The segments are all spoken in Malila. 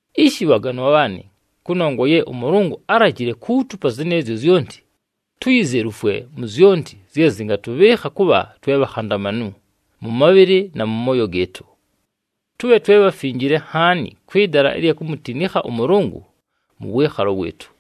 Ishi bhaganwa bhaanɨ, kʉnongwa ye ʉMʉlʉngʉ álajile kuutupa zɨnɨɨzyo zyonti, tuyizelufwe mu zyonti zye zɨngatʉbhɨɨkha kʉbha twe bhakhandamanu mʉ mabhɨlɨ na mʉ mooyo gɨɨtʉ. Tʉbhe twe bhafinjile nhaani kwɨ dala ɨlya kumutinikha ʉMʉlʉngʉ mʉ wɨɨkhalo wɨɨtʉ.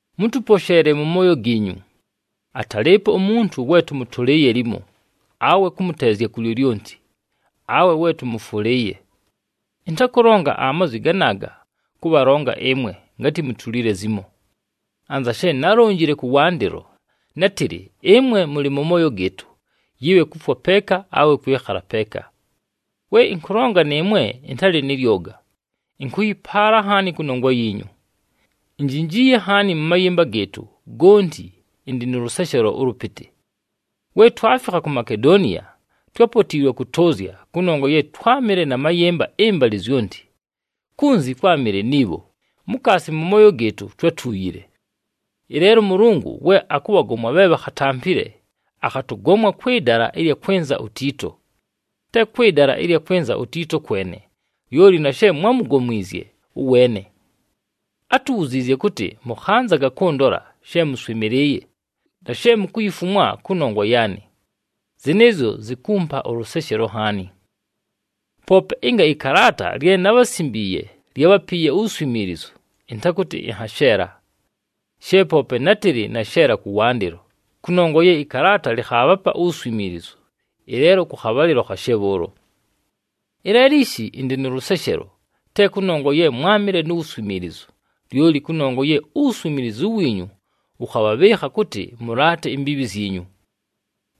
Mʉtʉposheele mʉ mooyo giinyu! Atalɨɨpo umuntu we tʉmʉtʉlɨɨye limo, awe kʉmʉteezya ku lyolyonti, awe we tʉmʉfwʉlɨɨye. Ɨntakʉlonga amazwi ganaaga, kʉbhalonga ɨmwe, ngatɨ mutulile zimo. Anza she nálonjile kʉwandɨlo, nátɨlɨ ɨmwe mʉlɨ mʉ mooyo gɨɨtʉ, yɨbhe kufwa peeka awe kwɨkhala peeka. We ɨnkʉlonga nɨɨmwe ɨntalɨ nɨ lyoga, ɨnkʉyɨpaala nhaani kʉnongwa yiinyu. Injinjiiye nhaani, mʉ mayɨmba gɨɨtʉ gonti ɨndɨ nʉ lʉseshelo ʉlʉpɨtɨ. We twafikha ku Makedoniya, twápotiilwe kʉtʉʉzya, kʉnongwa ye twámɨle na mayɨmba ɨmbalɨ zyonti. Kunzi kwámɨle ni bho, mukaasi mʉ mooyo gɨɨtʉ twátuuyile. Ɨleelo ʉMʉlʉngʉ we akʉbhagomwa bhe bhakhatampile, akhatʉgomwa kwɨ dala ɨlya kwɨnza uTiito. Te kwɨ dala ɨlya kwɨnza uTiito kwene, lyoli na she mwámugomwizye ʉweene. Átubhuziizye kʉtɨ mʉkhanzaga kʉndola, she mʉswɨmɨlɨɨye, na she mukuyifumwa kʉnongwa yaanɨ. Zɨnɨɨzyo zikumpa ʉlʉseshelo nhaani! Poope ɨnga ɨkalaata lye nábhasimbiiye lyábhapiiye uwuswimiilizu, ɨntakʉtɨ ɨnhasheela. She poope nátɨlɨ nasheela kʉwandɨlo, kʉnongwa ye ɨkalaata lɨkhaabhapa uwuswimiilizu, ɨleelo kʉ khabhalɨlo khashe bhʉʉlo. Ɨleelo ishi ɨndɨ nʉ lʉseshelo, te kʉnongwa ye mwámɨle nu wuswimiilizu, lyoli kʉnongwa ye uwuswimiilizu wiinyu wʉkhabhabhɨɨkha kʉtɨ mʉlaate imbiibhi zyinyu.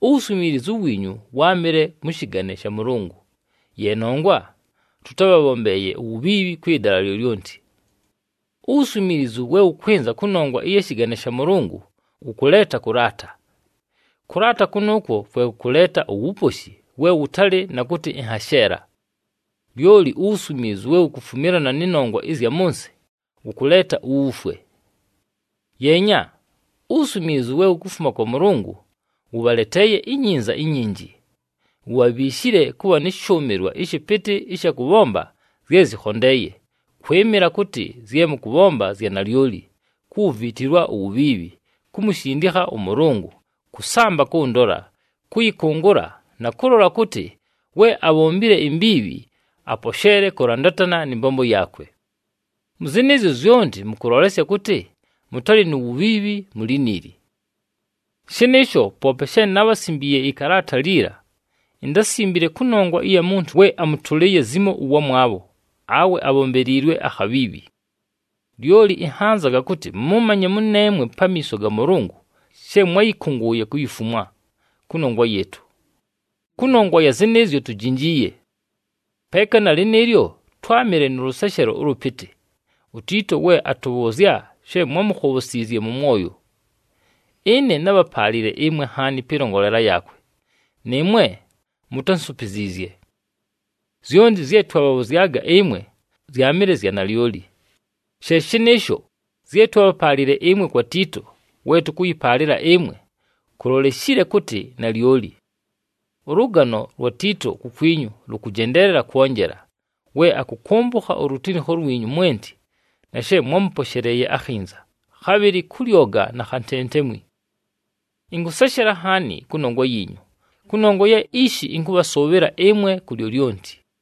Uwuswimiilizu wiinyu wáamɨle mʉ shɨgane sha Mʉlʉngʉ, ye nongwa tʉtábhabhombeeye uwubhiibhi kwɨ dala lyolyonti. Uwuswimiilizu we wʉkwɨnza kʉnongwa ɨya shɨgane sha Mʉlʉngʉ wʉkʉleeta kʉlaata. Kʉlaata kʉnʉʉkwo kwe kʉkʉleeta uwuposhi we wʉtalɨ na kʉtɨ ɨnhasheela. Lyoli uwuswimiilizu we wukufumilana nɨ nongwa ɨzya mʉ nsɨ, wʉkʉleeta uwufwe. Yeenya! Uwuswimiilizu we wukufuma kwa Mʉlʉngʉ, wʉbhaleteeye inyinza inyinji: wubhabhiishile kʉbha nɨ shʉʉmɨlwa ɨshɨpɨtɨ ɨsha kʉbhomba zye zɨkhondeeye, kwɨmɨla kʉtɨ zye mʉkʉbhomba zya nalyoli, kuwuviitilwa uwubhiibhi, kumushindikha ʉMʉlʉngʉ, kʉsamba kʉndola, kʉyɨkʉngʉla, na kʉlola kʉtɨ we abhombile imbiibhi aposheele kʉlandatana nɨ mbombo yaakwe. Mʉ zɨnɨɨzyo zyonti mʉkʉlolesya kʉtɨ mʉtalɨ nu wubhiibhi mu liniili. Shɨnɨɨsho, poope she nábhasimbiiye ɨkalaata liila, intásimbile kʉnongwa ɨya muntu we amʉtʉlɨɨye zimo ʉwamwabho, awe abhombeliilwe akhabhiibhi. Lyoli ɨnhanzaga kʉtɨ mʉmanye mʉneemwe pamiiso ga Mʉlʉngʉ she mwáyɨkʉngʉʉye kuyifumwa, kʉnongwa yɨɨtʉ. Kʉnongwa ya zɨnɨɨzyo, tujinjiiye. Peeka na lɨnɨɨlyo, twámɨle nʉ lʉseshelo ʉlʉpɨtɨ, uTiito we atʉbhʉʉzya she mwámukhobhosiizye mʉ mwoyo. Ɨne nábhapaalile ɨmwe nhaani pɨlongolela yaakwe, nɨɨmwe mutánsupiziizye. Zyonti zye twabhabhʉzyaga ɨmwe zyaamɨle zya nalyoli. She shɨnɨɨsho, zye twábhapaalile ɨmwe kwa Tiito we tʉkʉyɨpaalɨla ɨmwe, kuloleshile kʉtɨ nalyoli. Ʉlʉgano lwa Tiito kukwinyu lʉkʉjendeelela kwonjela, we akʉkʉmbʉkha ulutinikho lwinyu mwenti na she mwámʉposheleeye akhinza, khabhɨlɨ kʉ lyoga na khantentemwi. Ɨnkʉseshela nhaani kʉnongwa yiinyu, kʉnongwa ye ishi ɨnkʉbhasʉʉbhɨla ɨmwe ku lyolyonti.